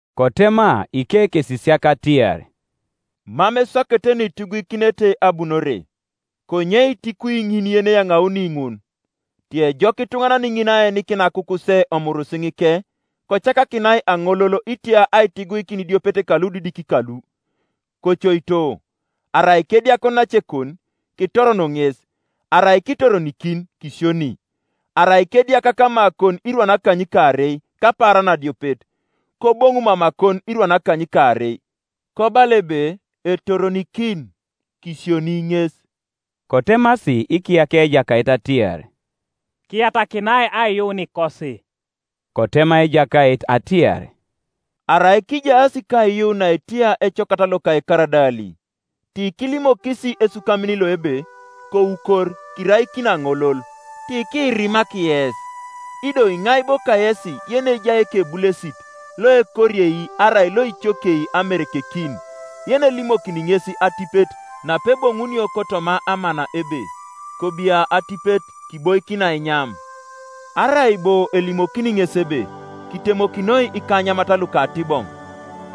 Kotema ikekesisiak atiar, “Mam eswakete nuitiguikinete abunore; konye itukwi ituŋanan ŋin yeneyaŋauni ŋun! Tiejok ituŋanan ŋin aenikin akukuse omurisiŋike, kocakakinai aŋolol itia aitiguikin idiopet kaludidik kalu. Kocoito; arai kediak onacekon, kitoron ŋes; arai kitoronikin kisioni. Arai kediak kamakon irwan akanykaarei kapaaran adiopet, koboŋu mamakon irwan akanykaarei, kobala ebe, ‘Etoronikin,’ kisioni ŋes.” Kotemasi ikiyakia Ejakait atiar, “Kiyatakinai aiyuunikosi!” Kotema Ejakait atiar, “Arai kijaas kaiyuun naetia ecokat loka ekaradali, tikilimokis esukamin lo ebe, ‘Koukor, kiraikin aŋolol.’ Tikiirimak yes. “Ido iŋai bo kayesi yenejai ekebulesit loekoriei arai loicokiei amerekekin yenelimokini ŋes atipet napeboŋunio kotoma amana ebe, ‘Kobia atipet kiboikin ainyam’. Arai bo elimokini ŋes ebe, ‘Kitemokinoi ikanyamat lukatiboŋ,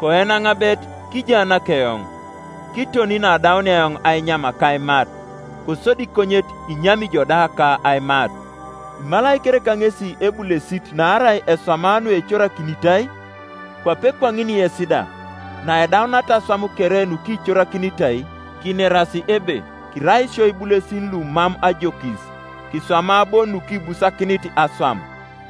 koen aŋabet, kijaanak eoŋ, kiton neadaunia eoŋ ainyam ka aimat; kosodi konyet inyami ijo da ka aimat’? Imalai kereka ŋesi ebulesit naarai eswama nuecorakinitai? Kwape kwaŋin yes da, naidauniata aswam kere nukicorakinitai, kineras ebe, ‘Kirai isio ibulesin lumam ajokis; kiswama bon nukibusakinit aswam.’”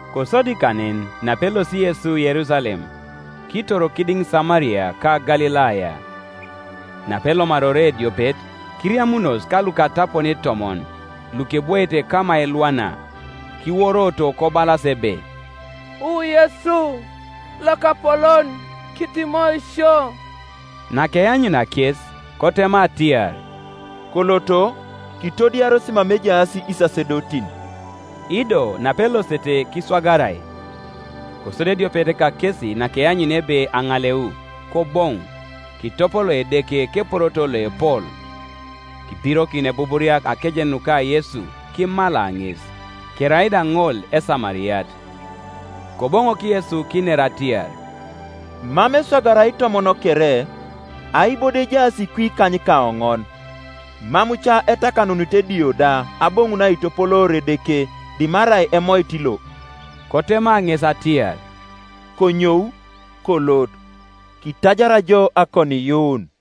Kosodi kanen napelosi Yesu Yerusalem, kitor kidiŋ Samaria ka Galilaya. Napelomari ore ediopet, kiriamunos kalukatapon itomon, lukebwoete kama elwana, kiworoto kobalas ebe, “Wu Yesu, Lokapolon, kitimoi sio.” Nakeanyunia kes kotema atiar, “Koloto, kitodiaros mama ejaas isasedotin.” Ido napelosete kiswagarai. Kosodi ediopet kakesi nakeanyunia ebe aŋaleu, koboŋu, kitopolo Edeke keporoto loepol. Kibirokin ebuburia akejen nuka Yesu, kimala ŋes. Kerai da ŋol Esamariat. Koboŋok Yesu kiner atiar, “Mam eswagara itomon kere? Ai bo do ejaas kwi ikanykaoŋon? Mam ca etakanunit edio da aboŋun aitopoloor Edeke dimarai emoit lo?” Kotema ŋes atiar, “Konyou, kolot; kitajar jo akoniiyuun.”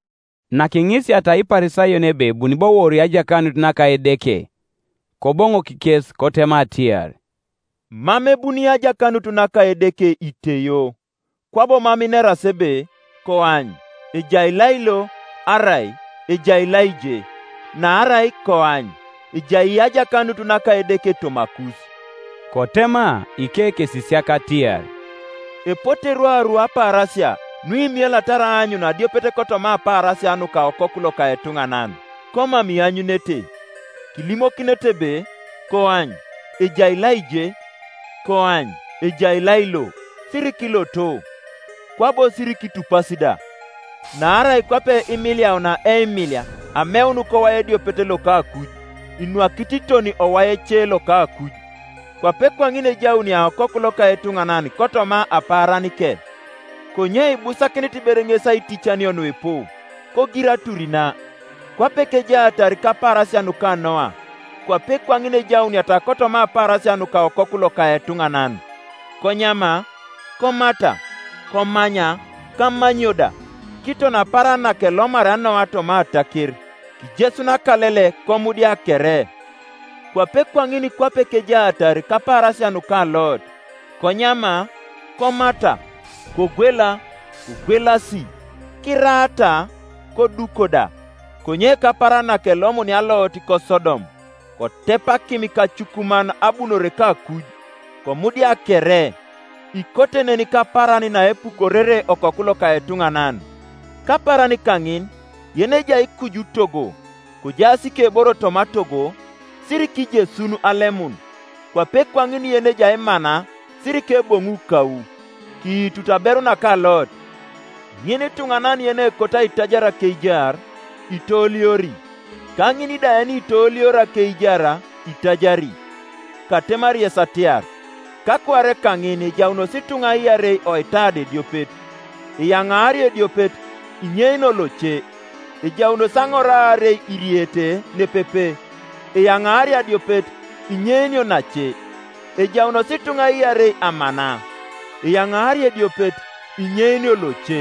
Nakiŋisiata Iparisayon ebe ebuni bo wori ajakanut naka Edeke, Koboŋok kes kotema atiar, “Mam ebuni ajakanut naka Edeke iteio; kwabo mam ineras ebe, ‘Koany, ejai lailo!’ arai, ‘Ejai laije!’ Naarai koany, ejai ajakanut naka Edeke tomakus.” Kotema ikekesisiak atiar, “Epote rwaru apaarasia, nuimielatar aanyun adiopet kotoma apaarasia nuka Okoku loka etuŋanan, komam ianyunete. Kilimokinete ebe, ‘Koany, ejai laije!’ ‘Koany, ejai lailo!’ Sirikiloto, kwabo sirikitupasi da. Naarai kwape imiliaunia eimilia ameun kowai ediopet loka akuj, inwakit kiton owai ece loka akuj, kwape kwaŋin ejaunia Okoku loka etuŋanan kotoma apaaranike. Konye ibusakinit ber ŋes aiticanio nuipu, kogir atur na. Kwape kejaatar kapaarasia nuka Noa, kwape kwaŋin ejauniata kotoma apaarasia nuka Okoku loka etuŋanan. Konyama, komata, komanya, ka amanyio da, kiton apaaran nakelomaria Noa toma ataker, kijesun akalele komudia kere. Kwape kwaŋin kwape kejaatar kapaarasia nuka Lot; konyama, komata, kogwela, kogwelasi, kiraata, koduko da; konye kapaaran nakelomunia Lot koSodom, kotep akim ka acukuman abunore kakuj, komudia kere. Ikote nen kapaaran naepukorere Okoku loka etuŋanan. Kapaaran kaŋin, yenejai kuju togo, kojaas ikeboro toma togo, sirikijesun alemun; kwape kwaŋin yenejai mana sirikeboŋu kau. Kiitut aberu naka Lot. Inituŋanan yenekoto aitajar akeijar, itooliori; ka ŋin da yenitooliori akeijar itajari. Katemari yes atiar, kakuare kaŋin ejaunos ituŋa iarei oitada ediopet; eyaŋaario ediopet, inyeinio loce. Ejaunos aŋor aarei iricete nepepe; eyaŋaario adiopet, inyeinio nace. [ Ejaunos ituŋa iarei amana; eyaŋaario ediopet, inyeinio loce]”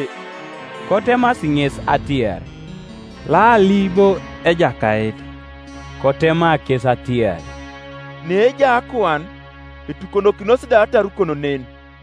Kotemasi ŋes atiar, “Laali bo, Ejakait?” Kotema kes atiar, “Neejai akuan, etukonokinos da atarukon nen.”